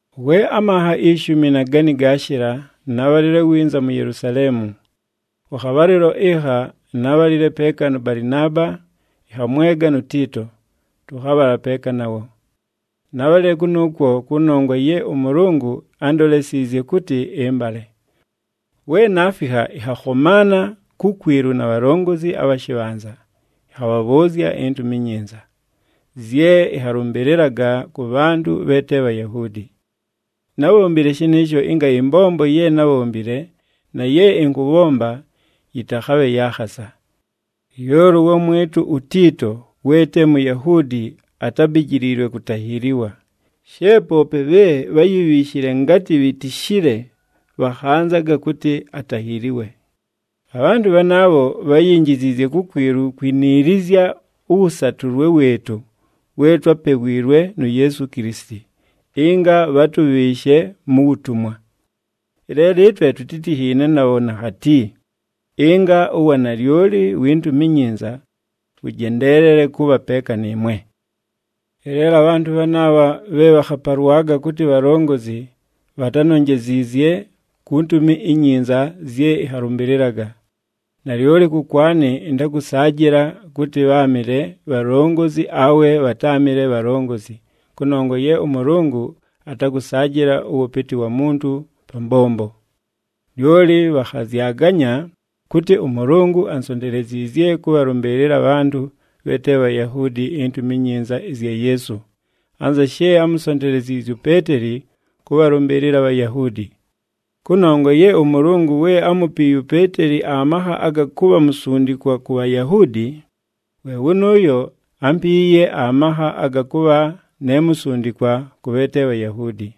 We amanha ishumi na gani gaashɨla, nábhalile winza mu Yelusaleemu. Kʉ khabhalɨlo ɨkha nábhalile peeka nʉ Balɨnaaba, ɨnhamwega nu Tiito, tʉkhabhala peeka nawo. Nábhalile kʉnʉʉkwo kʉnongwa ye ʉMʉlʉngʉ ándolesiizye kʉtɨ ɨmbale. We naafikha, ɨnhakhomaana kukwilu na bhalongozi abha shɨbhanza, ɨnhabhabhʉʉzya iNtumi iNyinza zye ɨnhalʉmbɨlɨlaga kʉ bhantʉ bhe te Bhayahuudi. Nábhombile shɨnɨɨsho ɨnga ɨmbombo ye nábhombile na ye ɨnkʉbhomba yɨtakhabhe ya khasa. Lyoli ʉwamwɨtʉ uTiito we te Muyahuudi atábijiliilwe kutahiiliwa, she poope bhe bháyibhiishile ngatɨ bhitishile bhakhanzaga kʉtɨ atahiiliwe. Abhantʉ bhanaabho bháyinjiziizye kukwilu kwiniilizya ʉwʉsatʉlwe wɨɨtʉ we twápewiilwe nu Yeesu Kilisiti, ɨnga bhatʉbhɨɨshe mu wutumwa. Ɨleelo ɨtwe tutítinhiine nabho nakhati, ɨnga uwanalyoli wi Ntumi iNyinza, wʉjendeelele kʉbha peeka nɨɨmwe. Ɨleelo abhantʉ bhanaabha bhe bhakhapalwaga kʉtɨ bhalongozi, bhatánonjeziizye ku Ntumi iNyinza zye ɨnhalʉmbɨlɨlaga. Nalyoli kʉkwanɨ ɨntakʉsaajɨla kʉtɨ bháamɨle bhalongozi awe bhatáamɨle bhalongozi, kʉnongwa ye ʉMʉlʉngʉ atakʉsaajɨla ʉwʉpɨtɨ wa muntu pa mbombo. Lyoli bhakhazyaganya kʉtɨ ʉMʉlʉngʉ ansonteleziizye kʉbhalʉmbɨɨlɨla abhantʉ bhe te Bhayahuudi iNtumi iNyinza ɨzya Yeesu, anza she ámusonteleziizye uPeeteli kʉbhalʉmbɨɨlɨla aBhayahuudi. Kʉnongwa ye ʉMʉlʉngʉ we ámupiiye uPeeteli amakha aga kʉbha musundikwa ku Bhayahuudi, we wʉnʉʉyo ámpiiye amakha aga kʉbha ne musundikwa kʉ bhe te Bhayahuudi.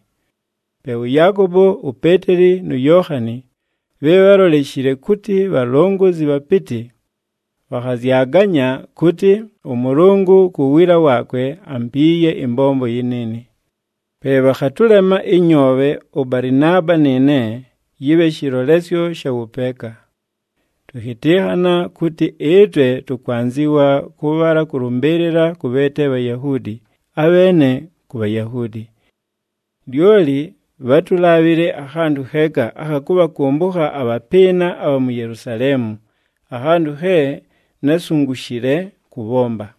Pe ʉYaakobo, uPeeteli nu Yookhani, bhe bháloleshile kʉtɨ bhalongozi bhapɨtɨ, bhakhazyaganya kʉtɨ ʉMʉlʉngʉ ku wiila waakwe ampiiye ɨmbombo yɨnɨɨnɨ. Pe bhakhatʉlema ɨnyoobhe ʉBalɨnaaba nɨɨne, yɨbhe shɨlolesyo sha wʉpeeka. Tʉkhɨtɨnhana kʉtɨ ɨtwe tʉkwanzɨwa kʉbhala kʉlʉmbɨɨlɨla kʉ bhe te Bhayahuudi, abheene ku Bhayahuudi. Lyoli bhátulaabhile akhantʉ kheeka, akha kʉbhakʉmbʉkha abhapɨɨna abha mu Yelusaleemu, akhantʉ khe násungushile kʉbhomba.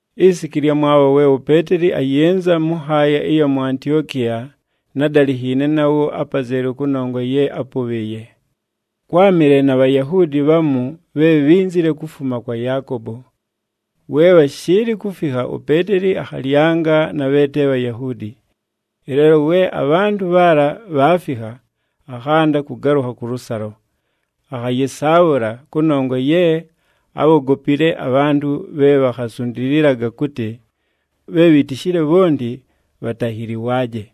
Isiku ɨlyamwabho we uPeeteli ayɨnza mʉ nhaaya ɨya mu Antiokiya nádalinhiine nawo apazelu kʉnongwa ye ápʉbhɨɨye. Kwámɨle na Bhayahuudi bhamu bhe bhínzile kufuma kwa Yaakobo. We bhashɨɨlɨ kufikha, uPeeteli akhalyanga na bhe te Bhayahuudi. Ɨleelo we abhantʉ bhaala bhaafikha, akhanda kʉgalʉkha kʉlʉsalo, akhayɨsaabhʉla, kʉnongwa ye ábhogopile abhantʉ bhe bhakhasundililaga kʉtɨ bhe bhitishile bhonti bhatahiliwaaje.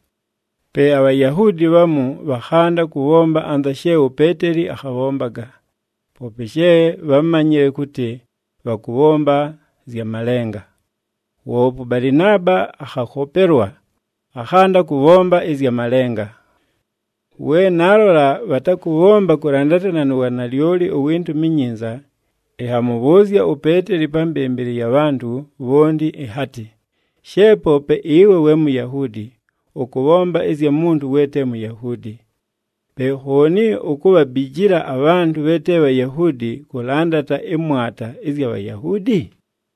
Pe aBhayahuudi bhamu bhakhanda kʉbhomba anza she uPeeteli akhabhombaga, poope she bhámanyile kʉtɨ bhakʉbhomba zya malenga. Woope ʉBalɨnaaba akhakhopelwa, akhanda kʉbhomba ɨzya malenga. We naalola bhatakʉbhomba kʉlandatana nu wanalyoli uwi Ntumi iNyinza, ɨnhamʉbhʉʉzya uPeeteli pa mbɨmbɨlɨ ya bhantʉ bhonti ɨnhatɨ, “She poope ɨwe we Muyahuudi, ʉkʉbhomba ɨzya muntu we te Muyahuudi. Pe khooni ukubhabijila abhantʉ bhe te Bhayahuudi kʉlandata ɨmwata ɨzya Bhayahuudi?”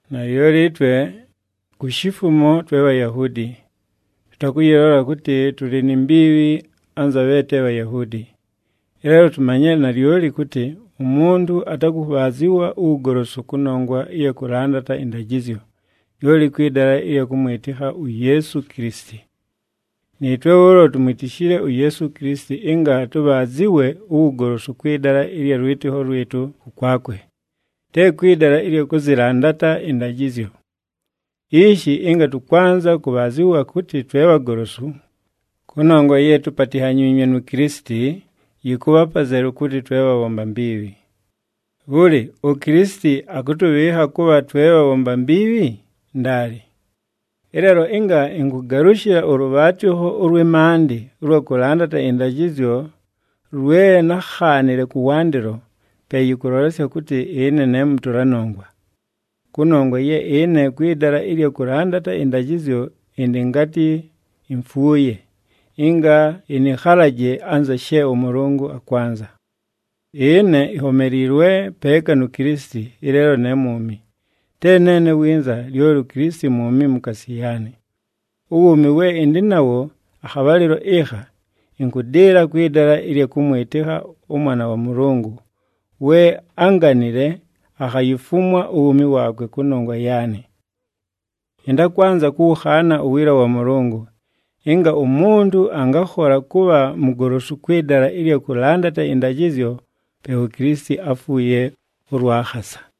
Nalyoli ɨtwe ku shifumo twe Bhayahuudi, tʉtakʉyɨlola kʉtɨ tʉlɨ ni mbiibhi anza bhe te Bhayahuudi. Ɨleelo tumanyile nalyoli, kʉtɨ umuntu atakʉbhaazɨwa uwugolosu kʉnongwa ɨya kʉlandata ɨndajɨzyo, lyoli kwɨ dala ɨlya kʉmwɨtɨkha uYeesu Kilisiti. Nɨɨtwe bhʉʉlo tumwitishile uYeesu Kilisiti ɨnga tʉbhaazɨwe uwugolosu kwɨ dala ɨlya lwɨtɨkho lwɨtʉ kʉkwakwe, te kwɨ dala ɨlya kʉzɨlandata ɨndajɨzyo. Ishi, ɨnga tʉkwanza kʉbhaazɨwa kʉtɨ twe bhagolosu, kʉnongwa ye tupatinhanyiinywe nu Kilisiti, yɨkʉbha apazelu kʉtɨ twe bhabhomba mbiibhi. Bhʉlɨ, uKilisiti akʉtʉbhɨɨkha kʉbha twe bhabhomba mbiibhi? Ndaali! Ɨleelo ɨnga ɨnkʉgalʉshɨla ʉlʉbhaatɨkho ʉlwɨ maandɨ ʉlwa kʉlandata ɨndajɨzyo lwe nákhaanile kʉwandɨlo, pe yɨkʉlolesya kʉtɨ ɨne ne mʉtʉla nongwa. Kʉnongwa ye ɨne kwɨ dala ɨlya kʉlandata ɨndajɨzyo ɨndɨ ngatɨ imfuuye, ɨnga ɨnɨkhalaje anza she ʉMʉlʉngʉ akwanza. Ɨne inhomeliilwe peeka nu Kilisiti, ɨleelo ne mwumi, te neene winza, lyoli uKilisiti mwumi mukaasi yaanɨ. Uwuumi we ɨndɨ nawo akhabhalɨlo ɨkha, ɨnkʉdɨɨla kwɨ dala ɨlya kʉmwɨtɨkha ʉMwana wa Mʉlʉngʉ, we ánganile, akhayifumwa uwuumi waakwe kʉnongwa yaanɨ. Ɨntakwanza kʉwʉkhaana uwiila wa Mʉlʉngʉ. Ɨnga umuntu angakhola kʉbha mugolosu kwɨ dala ɨlya kʉlandata ɨndajɨzyo, pe uKilisiti áfuuye ʉlwa khasa!